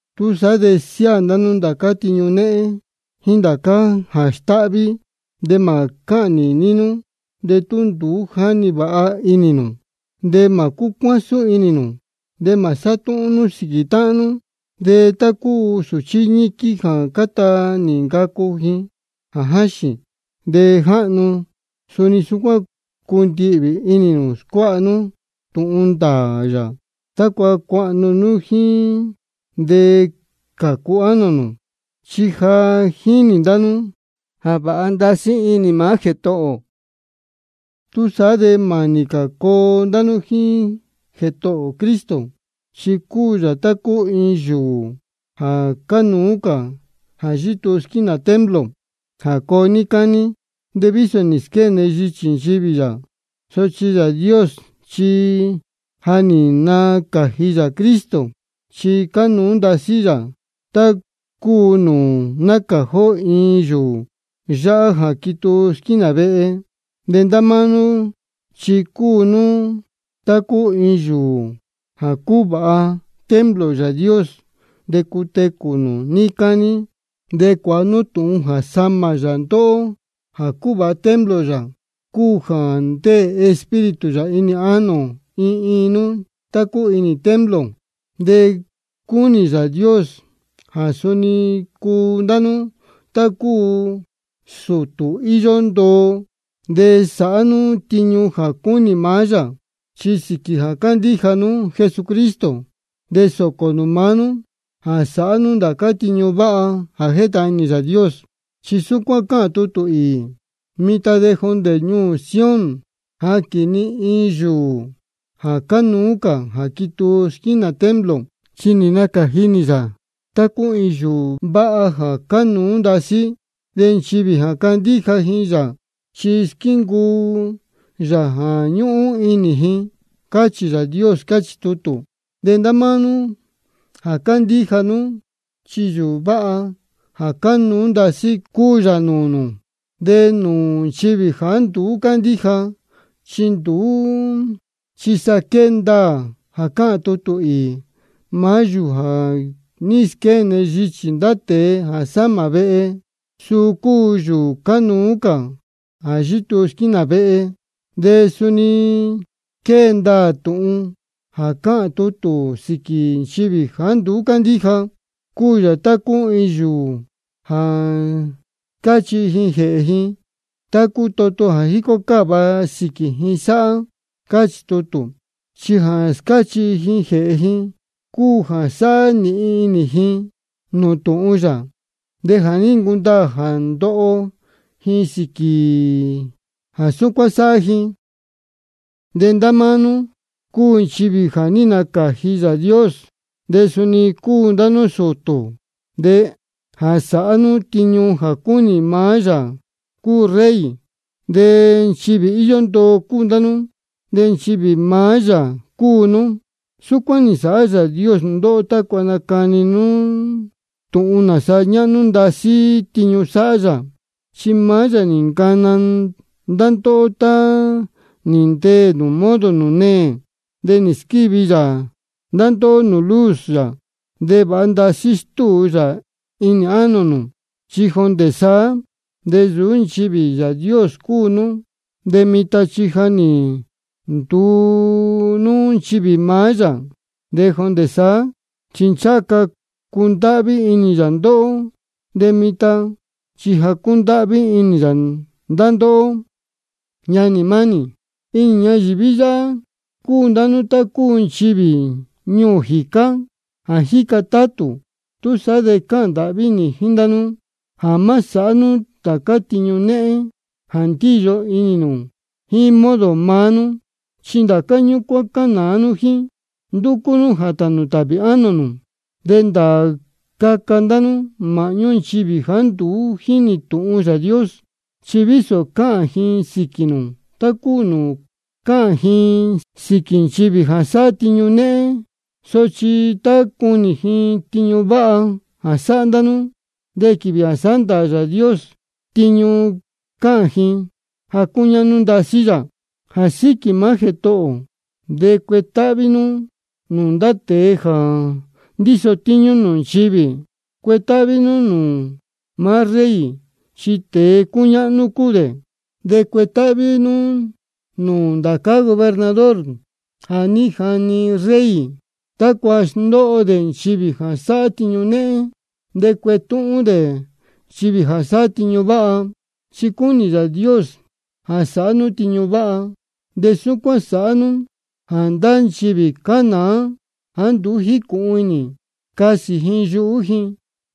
Túsaá de siáā ndá nú ndācá tiñu néhén, jíín ndācá jā stáhví, de mā cáhān nīní nú de tú nduú jáni vāha inī nū, de mā cúcuásún inī nū, de mā sátúhún nú sīquī táhán nú. De tá cúu sūchí ñíquín jā cáta nī ncacu, jā jáxīn de jáhnu, suni súcuán cundihvī inī nū scuáha nú tūhun ndāā yā, tácua cuahnu nú jíín de cācu ánō nū. Chi ja jínī ndá nú jā vāha ndasí inī maá Jētohō ō. Túsaá de mānī cā coo ndá nú jíín Jētohō ō Cristo. Chi cúu yā tá cúu iin yūū jā cánuú cā jā yítuu squínā templo, jā coo níí cání. De vísō nī squéne yichī nchivī yā, sochi Yāā Dios chi ja nī nacāji yā Cristo chi cánuú ndasí yā, tá cúu nūū nácāji ó iin yūū váha jā quituu squínā vehe. De ndá máá nú chi cúu nú tá cúu iin iin yūū jā cúvāha templo Yāā Dios, de cutecū nū níí cání. De cuāha nú tūhun jā samā yā ndá ndóhó jā cuvāha templo yā, cúu jā ndéē Espíritu yā inī ánō iin iin nú tá cúu inī iin templo. De cúnī Yāā Dios jā suni cuu ndá nú tá cúu sūtū íyó ndoo jā sāhá nú tiñu jā cúnī maá yā. Chi sīquī jā cándíja nú Jesucristo, de sōcō nū maá nú jā sāhá nú ndācá tiñu váha jā jétahān inī Yāā Dios. Chi súcuán cáhān tutū īī: Mitan de jondē ñuū ni Sión jáquīn ni iin yūū jā cánuú cā jā quituu squínā templo. Chi nī nacāji nī yā tá cúu iin yūū váha jā cánuú ndasí. De nchivī jā candíja ji yā, chi squíncuu yā jā ñúhún inī ji. Cáchī Yāā Dios, cáchī tutū. De ndá máá nú jā cándíja nú, chi yūū váha jā cánuú ndasí cúu yā nūū nū. De nūū nchivī jāá nduú cándíja chi nduú, chi sa quée ndaā jā cáhān tutū īī: Maá yūū jā ní squéne yichī ndá tēe jā sámā vehe, suu cúu yūū cánuú cā jā yítuu squínā vehe. De suni quée ndaā tūhun jā cáhān tutū sīquī nchivī jāá nduú cándíja: Cúu yā tá cúu iin yūū jā scáchihi ji jēhē ji, tá cúu toto jā jícó cáva ji sáhá. Cáchī tutū. Chi jā scáchihi ji jēhē ji cúu jā sáhá nīhin inī ji nūū tūhun yā. De ja nī ncundaā jā ndoho ji sīquī jā súcuán sáhá ji. De ndá máá nú cúu nchivī jā ní nacāji Yāā Dios. De suni cúu ndá nú sūtū jā sáhá nú tiñu jā cúnī maá Yāā cúu Rey. De nchivī íyó ndoo cúu ndá nú, de nchivī maá yā cúu nú. Súcuán nī nsāhá Yāā Dios ndóhó tácua nacani nú tūhun nāsa ñáhnú ndasí tiñu sáhá yā, chi maá yā nī ncana ndá ndóhó tá nī ndeē nū modo nūū neē. De nī squívi yā ndá ndóhó nūū luz yā jā vāha ndasí stúu yā inī ánō nū. Chi jondē saá de nsūú nchivī Yāā Dios cúu nú, de mitan chi ja nī nduu nú nchivī maá yā. De jondē saá chi ncháha ca cundáhví inī yā ndóhó, de mitan chi ja cúndáhví inī yā ndá ndóhó. Ñanī mánī, inī ñayīví yáhá cúu ndá nú tá cúu nchivī ñuū jīcá jā jíca tátū. Túsaá de cáhān ndāhví nī jíín ndá nú jā má sāhá nú ndācá tiñu néhén jā ndíyo inī nū jíín modo maá nú. Chi ndācá ñúcuán cánāá jíín nú, ndúcú jā tānū tāhvī ánō nū. De ndāā caca ndá nú māhñú nchivī jāá nduú jínī tūhun Yāā Dios. Chi vísō cáhān ji sīquī nū, tá cúu nūū cáhān ji sīquī nchivī jā sáhá tiñu néhén, sochi tá cunī ji tiñu váha jā sáhá ndá nú, de quīvī jā sāhá ndāā Yāā Dios tiñu de cāhān ji jā cúñáhnú ndasí yā. Jā síquī maá Jētohō ō de cuetáhví nú nūū ndá tēe jā ndíso tíñú nūū nchivī. Cuetáhví nú nūū maá rey, chi tēe cúñáhnú cā cúu dē. De cuetáhví nú nūū ndācá gobernador jā ní jani rey tácua sndóho dē nchivī jā sáhá tiñu néhén de cuetúhún dē nchivī jā sáhá tiñu váha. Chi cúnī Yāā Dios jā sāhá nú tiñu váha, de súcuán sāhá nú jā ndá nchivī cánaā jāá nduú jícūhun inī, casī ji yuhú ji.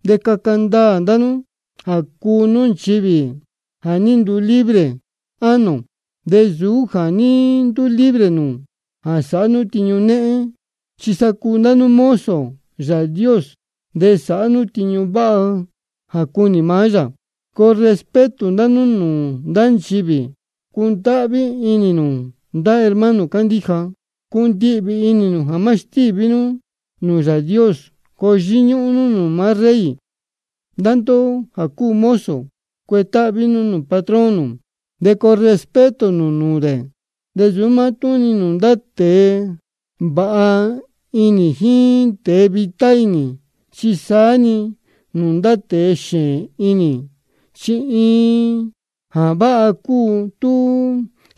De caca ndaā ndá nú jā cúu nú nchivī jā ní nduu libre ánō, de nsūú jā ní nduu libre nū jā sāhá nú tiñu néhén. Chi sa cúu ndá nú mozo Yāā Dios de sāhá nú tiñu váha jā cúnī maá yā. Coo respeto ndá nú nūū ndá nchivī. Cundáhví inī nū ndá hermano cándíja. Cundihvī inī nū jā má stíví nú nūū Yāā Dios. Coo yíñúhún nú nūū maá rey. Ndá ndóhó jā cúu mozo, cuetáhví nú nūū patrón nū, de coo respeto nū nūū dē. De nsūú mátúhún-ni nūū ndá tēe vāha inī jíín tēe vitá inī, chi saá-ni nūū ndá tēe xēēn inī. Chi iin jā váha cúu tú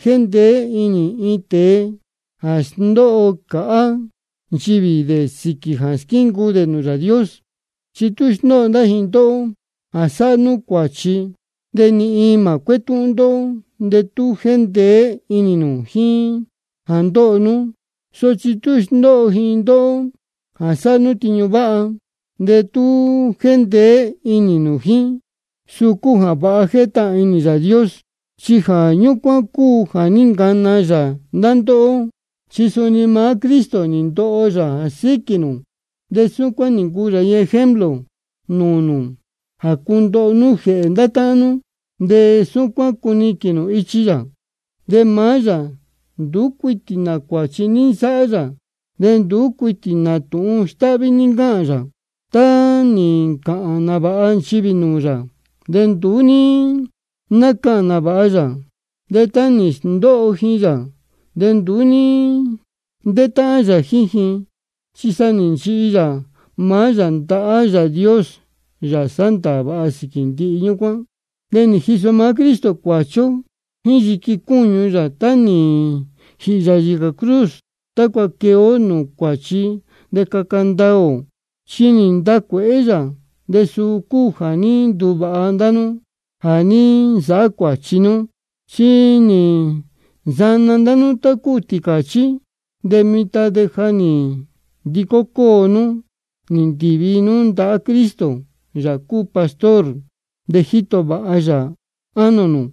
jéndeé inī iin tēe jā sndóho cāhá nchivī dē sīquī jā squíncuu dē nūū Yāā Dios. Chi tú sndóho ndá ji ndóhó jā sáhá nú cuāchi, de ni iin mā cuétúhún ndóhó de tú jéndeé inī nū jíín jā ndóho nú. Sochi tú sndóho ji ndóhó jā sáhá nú tiñu váha, de tú jéndeé inī nū jíín, suu cúu jā váha jā jétahān inī Yāā Dios. Chi jā ñúcuán cúu jā ní ncana yā ndá ndóhó. Chi suni maá Cristo nī ndoho yā jā síquī nū, de súcuán nī ncuu yā iin ejemplo nūū nū jā cundoho nú jēhē ndá táhán nú, de súcuán cuniquīn nū ichi yā. De maá yā nduú cuitī nā cuāchi ní nsáhá yā, de ni nduú cuitī nā tūhun stáhví ní ncáhān yā. Tá nī ncāhān nāvāha nchivī nūū yā, de nduú ní nácahān nāvāha yā. De tá nī sndóho ji yā, de nduú ní ntétáhán yā jíín ji, chi sa nī nchihi yā maá yā ndahá Yāā Dios, Yāā sándaā vāha sīquī ndihi ñúcuán. De nī jiso maá Cristo cuāchi ó jíín yiqui cúñu yā tá nī jīhī yā yīcā cruz, tácua quee ó nūū cuáchi de caca ndaā ō. Chi nī ntacuēhé yā, de suu cúu jā ní nduvāha ndá nú jā ní nsāhá cuāchi nú. Chi nī nsana ndá nú tá cúu tīcāchí, de mitan de ja nī ndicó cóo nú nī ndīvi nú ndahá Cristo, Yāā cúu pastor nū de jíto vāha yā ánō nū.